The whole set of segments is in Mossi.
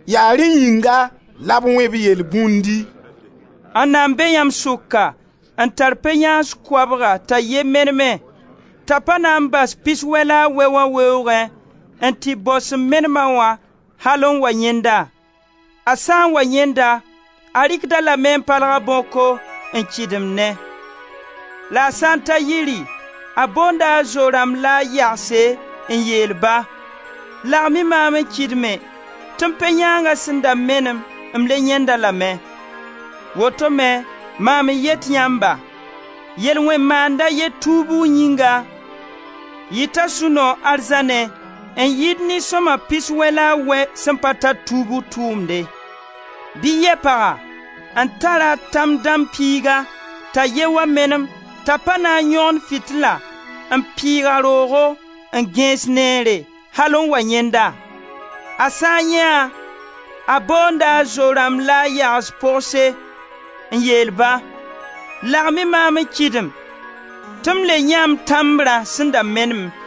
Yaa rẽ yĩnga la b wẽ-b yelbũndi: «Anna n be yãmb sʋka n tar pe-yãans koabga t'a ye meneme, t'a pa na n bas piswɛ la a wɛ wã weoogẽ n tɩ bao sẽn menem-a wã al n wa yãend-a? A sã n wa yãend-a, a rɩkd-a lame n palg a bãoko n kɩdemnẽ: la a sã n ta yiri, a boonda a zo-rãmb la a yagse n yeel ba: ‹Lagem-y maam n kɩdme tɩ m pe-yãanga sẽn da menem, m le yãend-a lame.› Woto me mam n yet yãmba, yel-wẽn-maand a ye tuubgu yĩnga, yɩta sũ-noog arzãnẽ n yɩɩd nin-sõma pis wɛ la a wɛ sẽn pa tar tuubg tʋʋmde. Bɩ yɛ paga, n tar a tãm-dãmb piiga t'a ye wa menem t'a pa na n yõgen fitila n pɩɩg a roogo n gẽes neere, al n wa yãend-a? A sã n yãee-a, a boonda a zo-rãmb la a yags pogse n yeel-ba: ‹Lagem-y maam n kɩdem tɩ m le yãee m tãmbrã sẽn da menem.›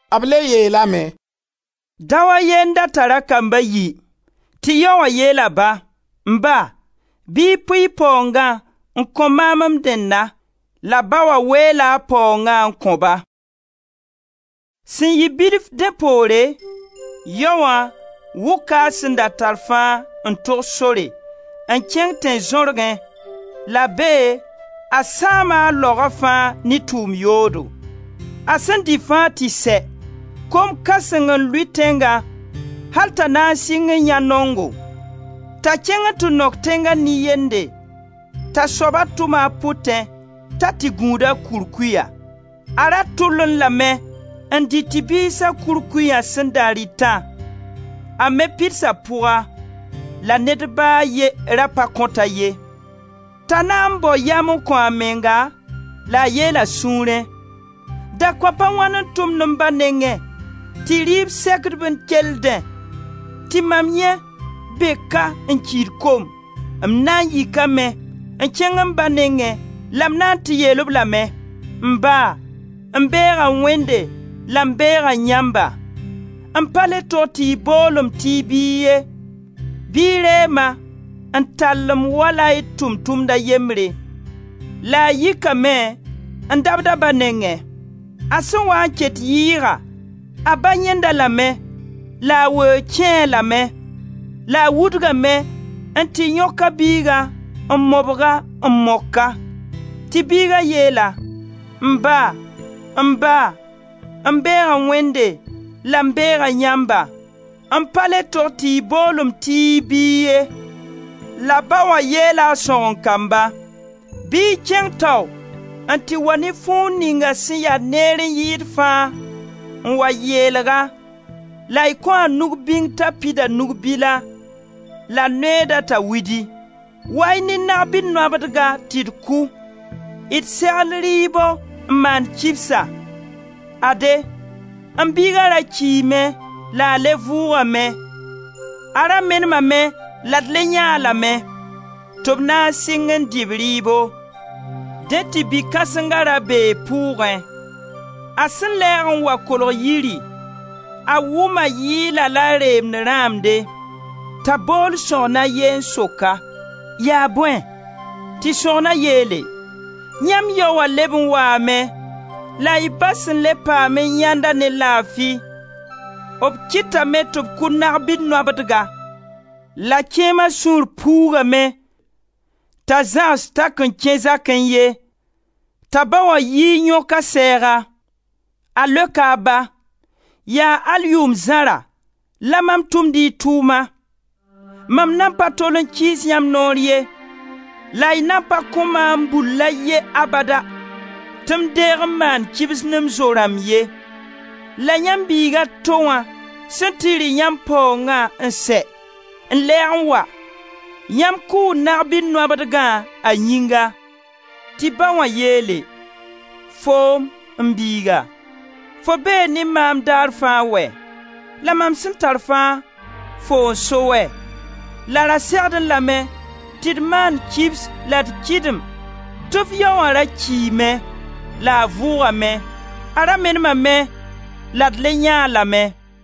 B le yeelame: «Dao a ye n da tar a kamb a yi. Tɩ yaoã yeel a ba: ‹M ba, bɩ y pʋɩ y paoongã n kõ maam m dẽnna›; la ba wã weela a paoongã n kõ-ba. Sẽn yɩ bilf dẽ poore, yaoã wʋka a sẽn da tar fãa n tog sore, n kẽng tẽn-zãorgẽ, la bee a sãama a laoga fãa ne tʋʋm yoodo. A sẽn dɩ fãa tɩ sɛ, kom kãseng n lʋɩ tẽngã al t'a na n sɩng n yãe naongo. T'a kẽng n tɩ nok tẽnga nin-yende, t'a soaba tʋma a pʋtẽ t'a tɩ gũud a kurkuya. A ra tʋllẽ lame n dɩ tɩ-biisa kurkuyã sẽn da rɩtã, a me pids a pʋga, la ned ba a ye ra pa kõt-a ye. T'a na n bao yam n kõ a menga la a yeel a sũurẽ: ‹Dakõap a wãn n tʋmd m ba nengẽ tɩ rɩɩb sekd-b n keldẽ tɩ mam yẽ be ka n kiid kom! M na n yikame n kẽng m ba nengẽ, la m na n tɩ yeel-b lame: M ba, m beega Wẽnde la m beega yãmba. M pa le tog tɩ y bool-m tɩ y biig ye; bɩ y reeg-ma n tall-m wala y tʋʋm-tʋmd a yembre.› La a yikame n dabd a ba nengẽ. A sẽn waa n ket yɩɩga, a ba yãend-a lame, la a weoog kẽe-a lame; la a wudgame n tɩ yõk a biigã n mobg-a, n mok-a. Tɩ biiga yeel-a: ‹M ba, m ba, m beega Wẽnde la m beega yãmba; m pa le tog tɩ y bool-m tɩ y biig ye.› La ba wã yeela a sõgen-kamba: ‹Bɩ y kẽng tao n tɩ wa ne fuug ninga sẽn yaa neer n yɩɩd fãa n wa yeelg-a la y kõ-a nug-bĩng t'a pid a nug-bila la neooda t'a widi. Wa-y ne nag-bil nobdga tɩ d kʋ. D segl rɩɩbo n maan kibsa. Ade, m biiga ra kiime la a le vʋʋgame; a ra menemame la d le yãee-a lame.› Tɩ b na n sɩng n dɩ b rɩɩbo. Dẽ tɩ bi-kãsenga ra bee pʋʋgẽ; a sẽn lɛɛg n wa kolg yiri, a wʋma yɩɩla la reem rãmde. T'a bool sõgen a ye n sok-a: ‹Yaa bõe?› Tɩ sõgna yeele: ‹Yãmb yao wã leb n waame la y ba sẽn le paam n yãend-a ne laafi b kɩtame tɩ b kʋ nag-bi-nobdga.› La kẽema sũur puugame t'a zãgs t'a kõn kẽ zakẽ ye, t'a ba wã yii n yõk a sɛɛga. A leoka a ba: ‹Yaa al yʋʋm zãra la mam tʋmd y tʋʋma; mam nan pa tol n kɩɩs yãmb noor ye la y nan pa kõ maam bull a ye abada tɩ m deeg n maan kibs ne m zo-rãmb ye. La yãmb biig a to wã sẽn tɩ rɩ yãmb paoongã n sɛ, n lɛɛg n wa, yãmb kʋʋ nag-bi-nobdgã a yĩnga.› Tɩ ba wã yeele: ‹Foom, m biiga, fo bee ne maam daar fãa wɛ! La mam sẽn tar fãa, foo n so wɛ! La ra segdẽ lame tɩ d maan kibs la d kɩdem tɩ f yaoã ra kiime la a vʋʋgame, a ra menemame, la d le yãee-a lame!›»